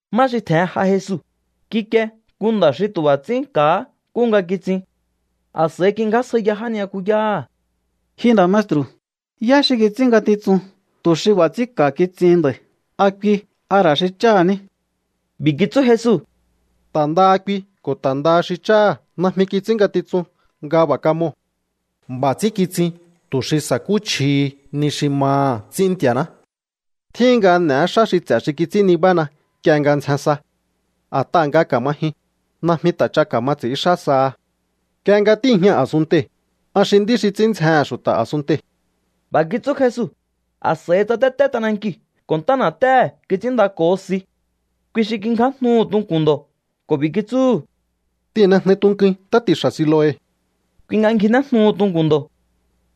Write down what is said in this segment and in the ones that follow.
Má xi tje̱hen j'a Jesu, kikie nku nda̱ xi tu̱ b'a̱ ts'ín ka̱há nkúhu nga kitsin. A̱s'a̱i kingjásjaiya já ni'yakuyáha̱: —Ji nda̱ maestru̱, ¿yá xi kits'ín ngatitsun tu̱ xi b'a̱ ts'ín ka̱ kitsihin nda̱i̱? ¿A kui, a ra̱ xi cháha̱ ní? B'i̱ kitsú Jesu: —Ta̱ ndaha kui ko̱ ta̱ ndaha xi cháha̱ najmi kits'ín ngatitsun nga b'a̱ kamoo̱. B'a̱ ts'ín kitsin tu̱ xi sa̱kúchjihi ni xi maha̱ ts'ín Nti̱a̱ná. Tjíhin nga n'e̱é xá xi ts'e̱ xi kits'ín nibána nk'ie nga ndzjen sa. A̱t'aha̱ nga ka̱ma jyun, najmi ta̱ ch'a ka̱ma ts'i̱ínxá saha. Nk'ie nga tíi̱jña a̱sunntei̱, an xi nd'í xi ts'ín ndzjehe̱n xu̱ta̱ a̱sunntei̱. B'a̱ kitsú Jesu, a̱s'a̱i tsatété t'anankiu̱ ko̱ ntá na̱téhe̱ kits'ínndako̱ho si. Kui xi kingjájnuhu̱ tunku̱n ndo̱ ko̱ b'i̱ kitsúhu̱: —T'ihi̱nnejnui tunkuin ntá ti̱xa̱ Siloe. Kui nga ngjinéjnuhu tunku̱n ndo̱.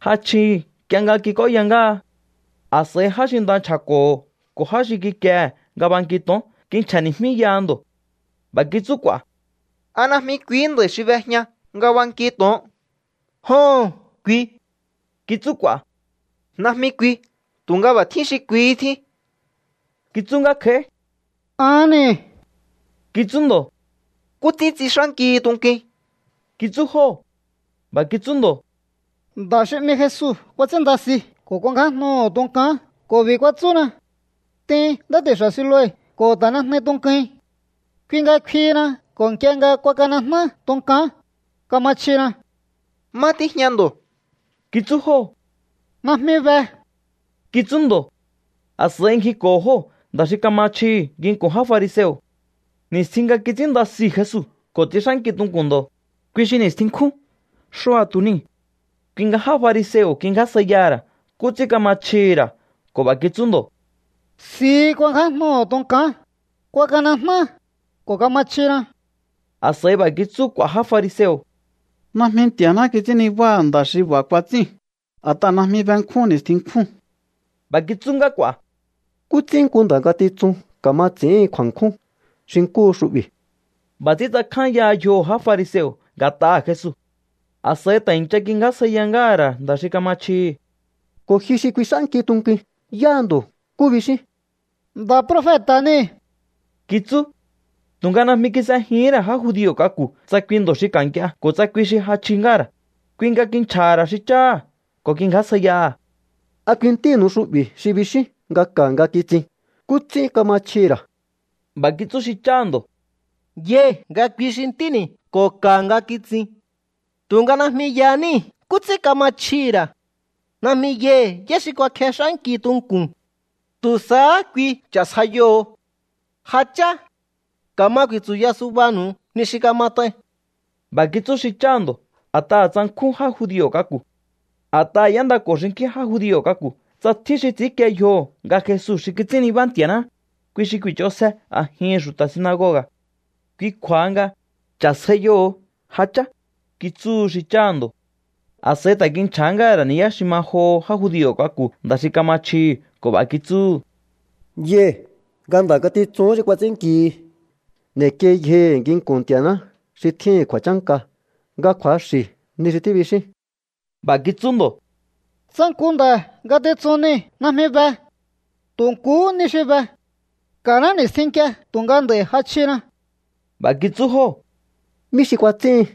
Ja chjihi̱ nk'ie nga kik'óya ngáha. A̱s'a̱i já xi nda nchja̱ko̱ho̱ ko̱ já xi kikiehe̱ nga banki to̱on kinchja̱ni̱jmíyaha ndo̱. B'a̱ kitsú k'u̱a̱: —¿A najmi kuihí nda̱i̱ xi b'ejña nga banki to̱on? —Joho̱n, kui —kitsú k'u̱a̱. —Najmi kui, tu̱nga b'a̱ tjín xi kuihí tjín —kitsú ngá kj'a̱í. —Ahán niu̱ —kitsú ndo̱. —¿Nkú ts'ín tsix'ánkihi tunkuin? —kitsú jóo̱. B'a̱ kitsú ndo̱: —Nda̱ xi 'mi Jesu kuats'ínnda si ko̱ kuangjájnuhu̱ tunkán ko̱ b'i̱ kuatsúna: “T'in ntá ti̱xa̱ Siloe ko̱ ta̱nejnui tunkuin.” Kui nga kfihina ko̱ nk'ie nga kuakanejná tunkán, kama chjina. —¿Má tíjña ndo̱? —kitsú jóo̱. —Najmi be —kitsú ndo̱. A̱s'a̱i ngjiko̱ho̱ jóo̱ nda̱ xi kama chjihi̱ nginku̱n já fariseo̱. Ni̱stjin nga kits'ínnda siu̱ Jesu ko̱ tsix'ánki tunku̱n ndo̱, kui xi ni̱stjin nkjún. Xua̱tu̱ niu̱. Kui nga já fariseo̱ kingjásjaiyaha̱ ra̱ nkú ts'ín kama chjihi̱ ra̱ ko̱ b'a̱ kitsú ndo̱: —Si kuangjájnuhu̱ tunkán, kuakanejná, ko̱ kama chjina. A̱s'a̱i b'a̱ kitsú k'u̱a̱ já fariseo̱: —Najmi Nti̱a̱ná kits'ín nibáha̱ nda̱ xi b'a̱ kuats'íu̱n, a̱t'aha̱ najmi benkjún ni̱stjin nkjúu̱n. B'a̱ kitsú ngá k'u̱a̱: —¿Nkú ts'ín nku nda̱ ngatitsun ka̱ma ts'i̱íhin kju̱a̱nkjún xi nkúhu xu'bi̱? B'a̱ ts'ín tsakjányaha yjoho̱ já fariseo̱ nga̱t'aha̱ Jesu. A̱s'a̱i ta̱ i̱ncha kingjásjaiyahá ngáha̱ ra̱ nda̱ xi kama chjihi̱: —Ko̱ ji xi kuix'ánki tunkuin, ¿yáha ndo̱? ¿Nkú bixín? —Nda̱ profeta̱ niu̱ —kitsú. Tu̱nga najmi kis'ejihín ra̱ já judio̱ k'aku̱ tsa kui ndo̱ xi ka̱ nk'ie ko̱ tsa kui xi ja chji ngáha̱ ra̱. Kui nga kinchja̱ha̱ ra̱ xi cháha̱ ko̱ kingjásjaiyaha̱: —¿A kui ntínu̱u xu'bi̱ xi bixíún nga ka̱ nga kitsin? ¿Nkú ts'ín kama chjihi̱ ra̱? B'a̱ kitsú xi cháha̱ ndo̱: —Yai̱ nga kui xi ntíni̱ ko̱ ka̱ nga kitsin. Tu̱nga najmi yaníi̱ nkú ts'ín kama chjihi̱ ra̱. Najmi yai̱ yá xi kuakjex'ánki tunku̱n. Tu̱ sahá kui cha̱sjaiyoho̱o. Ja chá. Ka̱ma ku̱i̱tsu̱ya subanu̱u ni xi kamat'ain. B'a̱ kitsú xi cháha̱ ndo̱ a̱t'aha̱ tsankjún já judio̱ k'aku̱. A̱t'aha̱ y'éndako̱ xinkjín já judio̱ k'aku̱ tsa tjín xi ts'i̱ínkie yjoho̱ nga Jesu xi kits'ín nibá Nti̱a̱ná, kui xi ku̱i̱ch'onsje a̱jihi̱n xu̱ta̱ sinagoga̱. Kui kju̱a̱ha nga: “Cha̱sjaiyoho̱o, ja chá”, kitsúhu xi cháha̱ ndo̱. A̱s'a̱i ta̱ kinchja̱há ngáha̱ ra̱ ni̱yá xi ma joho já judio̱ k'aku̱ nda̱ xi kama chjihi̱ ko̱ b'a̱ kitsúhu̱: —Yai̱ nga nda̱ ngatitsuhún xi kuats'ínnkihi. N'e̱kiei yjohi̱ nginku̱n Nti̱a̱ná xi tjíhi̱n kju̱a̱chánka nga kju̱axi̱ ni xi tíbixín. B'a̱ kitsú ndo̱: —Tsa nku nda̱ ngatitsun niu̱ najmi be. Tu̱ nkuhú ni xi be. Ka̱ná ni̱stjin nk'ie tu̱nga nd'a̱i̱ ja chjina. B'a̱ kitsú jóo̱: —¿Mí xi kuats'íhin?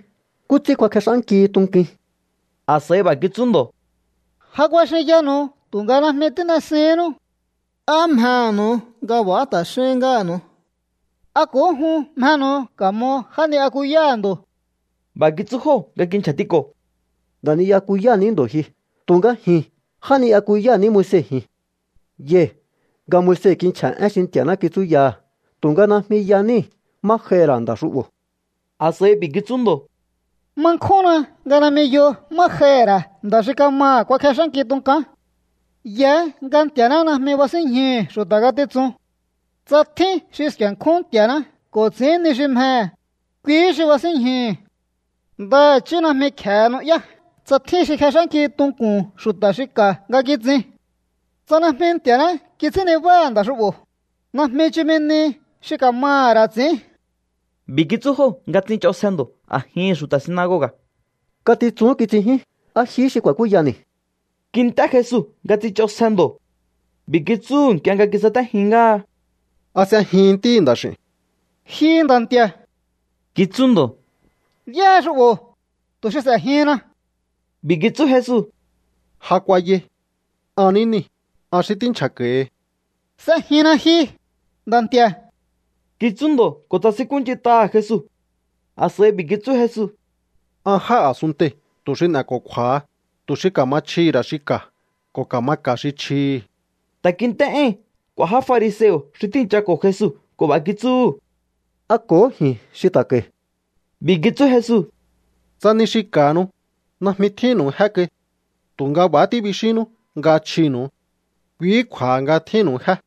¿Nkú ts'ín kuakjex'ánkihi tunkuin? A̱s'a̱i b'a̱ kitsú ndo̱: —Ja kuaxinyanu̱u tu̱nga najmi tín'esihínnú. ¿Á mjehe̱nu̱u nga b'a̱há ta̱ xín ngáha̱nu̱u? ¿A ko̱hó jun mjenu̱u ka̱mo já ni'yakuyáha̱ ndo̱? B'a̱ kitsú jóo̱ nga kinchja̱tiko̱: —Nda̱ ni'yakuyáha̱ ní ndo̱ ji. Tu̱nga ji̱n já ni'yakuyáha̱ ní Moise ji̱n. Yai̱ nga Moise kinchja̱ én xi Nti̱a̱ná kitsúyaha̱, tu̱nga najmi ya níi̱ má j'aihi̱ ra̱ nda̱ xu'bo̱. A̱s'a̱i b'i̱ kitsú ndo̱: —Ma nkjúnna nga najmi yo má j'aihi̱ ra̱ nda̱ xi kamaha̱ kuakjex'ánki tunkán. Yaá nga Nti̱a̱ná najmi basínñjuhu̱ xu̱ta̱ ngatitsuu̱n. Tsa tjín xi sku̱e̱nkjún Nti̱a̱ná ko̱ ts'i̱ín ni xi mjehe̱, kuihí xi basínñjuhu̱. Ndaha̱chí najmi kje̱e nu'yá tsa tjín xi kjex'ánki tunku̱n xu̱ta̱ xi ka̱ nga kitsin. Tsa najmi Nti̱a̱ná kits'ín nibáha̱ nda̱ xu'bo̱, najmi chumi nihi xi ka̱maha̱ ra̱ ts'i̱ín. B'i̱ kitsú jóo̱ nga tsich'onsje ndo̱ a̱jihi̱n xu̱ta̱ sinagoga̱: —Ngatitsun kitsinjín. ¿A jihí xi ku̱a̱kúyani̱? Kint'é Jesu nga tsich'onsje ndo̱. B'i̱ kitsúhu̱ nk'ie nga kisatéjin ngáha: —¿A s'ejihin Ntíhi̱ Nda̱x'i̱u̱n? —Ji Nda̱ Nti̱a̱ —kitsú ndo̱—, ¿yáha xu'bo̱, tu̱ xi s'e̱jihinna? B'i̱ kitsú Jesu: —Ja kuayai. An ní niu̱, an xi tínchjako̱hi. —S'ejinna ji, Nda̱ Nti̱a̱ —kitsú ndo̱ ko̱ tsasinkúnch'int'aha̱ Jesu. A̱s'a̱i b'i̱ kitsú Jesu: —An jáa̱ a̱sunntei̱ tu̱ xi n'e̱ko̱kju̱a̱ha, tu̱ xi ka̱ma chjihi̱ ra̱ xi ka̱ ko̱ ka̱ma ka̱ xi chjihi̱. Ta̱ kint'é éi̱n k'u̱a̱ já fariseo̱ xi tíi̱nchako̱ Jesu ko̱ b'a̱ kitsúhu̱: —¿A ko̱hó ji̱n xi ta̱ ka̱i̱? B'i̱ kitsú Jesu: —Tsa ni xi ka̱hanu, najmi tjínnu̱u jé kai. Tu̱nga b'a̱há tíbixínnú nga chjinu̱u. Kuihí kju̱a̱ha nga tjíhi̱nnu̱u jé.